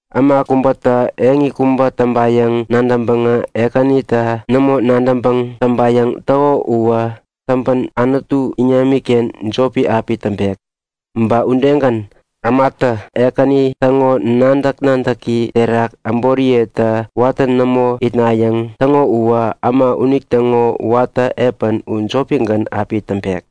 Äma kubätä eŋi kubä täŋpayäŋ nadäŋpäŋä Ekänita nämo nadäŋpäŋ täŋpayäŋ täko uwä täŋpän Anutu iŋamiken jopi api täŋpek. Ba udegän, ämatä Ekäni täŋo nadäk-nadäki terak äboriyeta watä nämo itnayäŋ täŋo uwä äma unitäŋo watä epän u jopigän api täŋpek.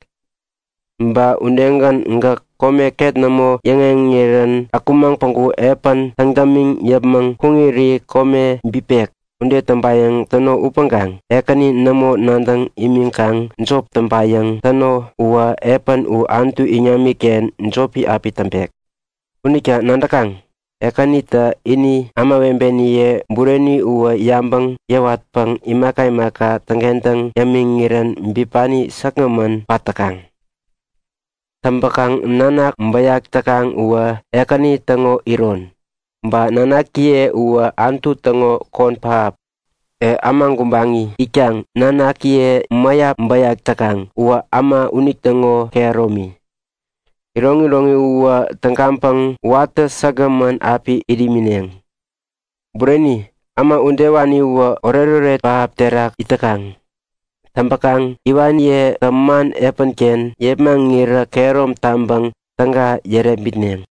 Ba udegän, gäk kome ket nämo yäŋeŋirän akumaŋ päŋku epän täŋ dämiŋ yäpmäŋ kuŋiri kome bipek. Ude täŋpayäŋ täno upäŋkaŋ Ekäni nämo nadäŋ imiŋkaŋ jop täŋpayäŋ täno uwä epän u Anutu iŋamiken jopi api täŋpek. Unita nadäkaŋ? Ekänitä ini ämawebeniye bureni uwä yabäŋ yäwatpäŋ imaka imaka täŋkentäŋ yämiŋirän bipani säkgämän pat täkaŋ. Täŋpäkaŋ nanak bäyak täkaŋ uwä Ekäni täŋo iron. Ba nanakjiye uwä Anutu täŋo kon pähap. E, äma gubaŋi itkaŋ nanakiye mäyap bäyak täkaŋ uwä äma unitäŋo kehäromi. Iroŋiroŋi uwä tägaŋpäŋ watä säkgämän api it imineŋ. Bureni, äma udewani uwä oretoret pähap terak it täkaŋ. Täŋpäkaŋ iwaniyetä man epänken yepmaŋirä kehärom taŋpäŋ täga yärepmitneŋ.